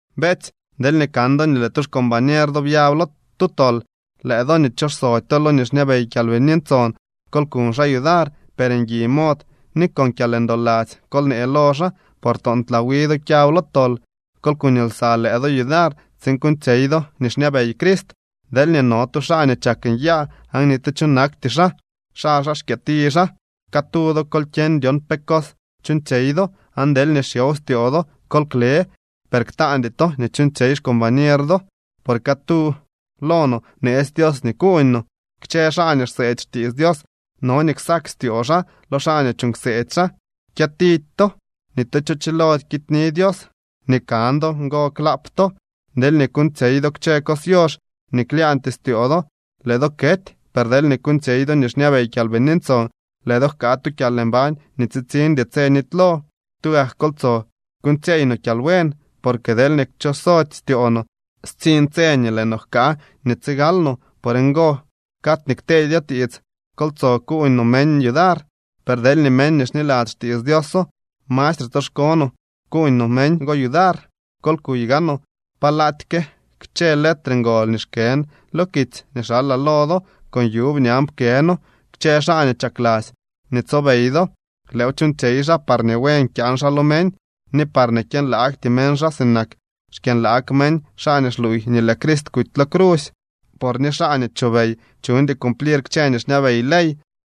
Beetsy, deelñee kan do nii lëë tu xcombañer do byab lo tu tol, lëë do nii xchooxsody lo nii xñabey Kyalbini Ntson, kol kuñ xaa yudar. Per ngui mod ni con kyalndoladzy kol nee lo xaa, por toontlaa wi do kyab lo tol. Kol kuñ lsa lëë do yudar, tsiin kuuñtsyey do nii xñabey Crist. Deelñee no tu xaa nii chak nyaa, aan ni tu cho nakty xaa, xaly xaa xkyëti xaa. Catu do, kol kyeñ dyon pe cos chuuñtsyey do, aan deelñee xyow styoo do, kol kle, per ktaandy to nii chuuñtsyey xcombañer do. Por catu lo no bneetsy Dios nii kuuñ no. Kchë xaa nii xseedy xtiits Dios no nii ksak styoo xaa lo xaa nii chuuñ kseedy xaa. Kyëtidy to. Ni tu cho chilody kityni Dios. Nii kan do ngo klaap to. Deelñee kuuñtsyey do kchë cos yox nii klyaañtyee styoo do, lëë do kety. Per deelñee kuuñtsyey do nii xñabey Kyalbini Ntson, lëë do jkaa tu kyalmbañ nii tsitsiñdy tse nitylo. Tugak kol tsoo kyuuñtsyeey no kyalbuen, porque deelñee kchosody styoo no, stsiñ tse nii lëë no jkaa nii tsigal no. Por ngo cad nii kteedyo tiits kol tsoo kuuñ no meñ yudar. Per deelñee meñ nii xniladzy xtiits Dioso, mastre tsoxko no kuuñ no meñ go yudar. Kol kuy gaanoo palaaty ke kchë letre ngol nii xkën lo kitsy nii xalaa lo do. Con yuub ñan pkëno. Kchë xaa nii chakladzy nii tsobey do, lëëw chuuñtsyey xaa parñee buen kyaan xaa lo meñ, ni parñee kyënlaagty meñ xaa sinak xkyënlaag meñ xaa nii xluuy nii lëë Crist kuty lo crusy. Por ni xaa nii chobey chuñdy cumplir kchë nii xñabey ley.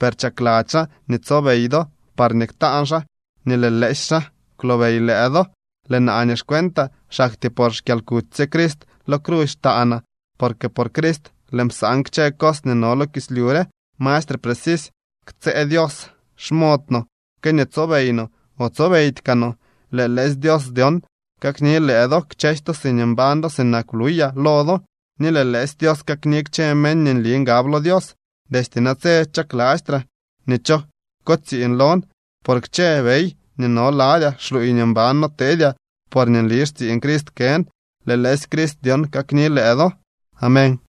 Per chakladzy xaa nii tsobey do parñee ktaan xaa nii lëë lëësy xaa kwlobey lëë do. Lëë naa nii xcuentaa, xaktyee por xkyalkuty sye Crist lo crusy xtaanaa. Porque por Crist lëën psan kchë cos nii no lo kislyu re. Mastre precisy ktsëë Dios xmod no que nii tsobey no o tsobeydy kaa no. Lëë lëësy Dios dyon kakni lëë do, kchësy to siñee mbañ do sinak bluyaa lo do, ni lëë lëësy Dios kakni kchë meñ nii nli ngab lo Dios. Destye natse chaklastraa nii cho kotsiiñ lon, por kchë bey nii no ladyaa xluuy nii mban noteedyaa porñee nli xtsiiñ Crist kën. Lëë lëësy Jesucrist dyon kakni lëë do. Amén.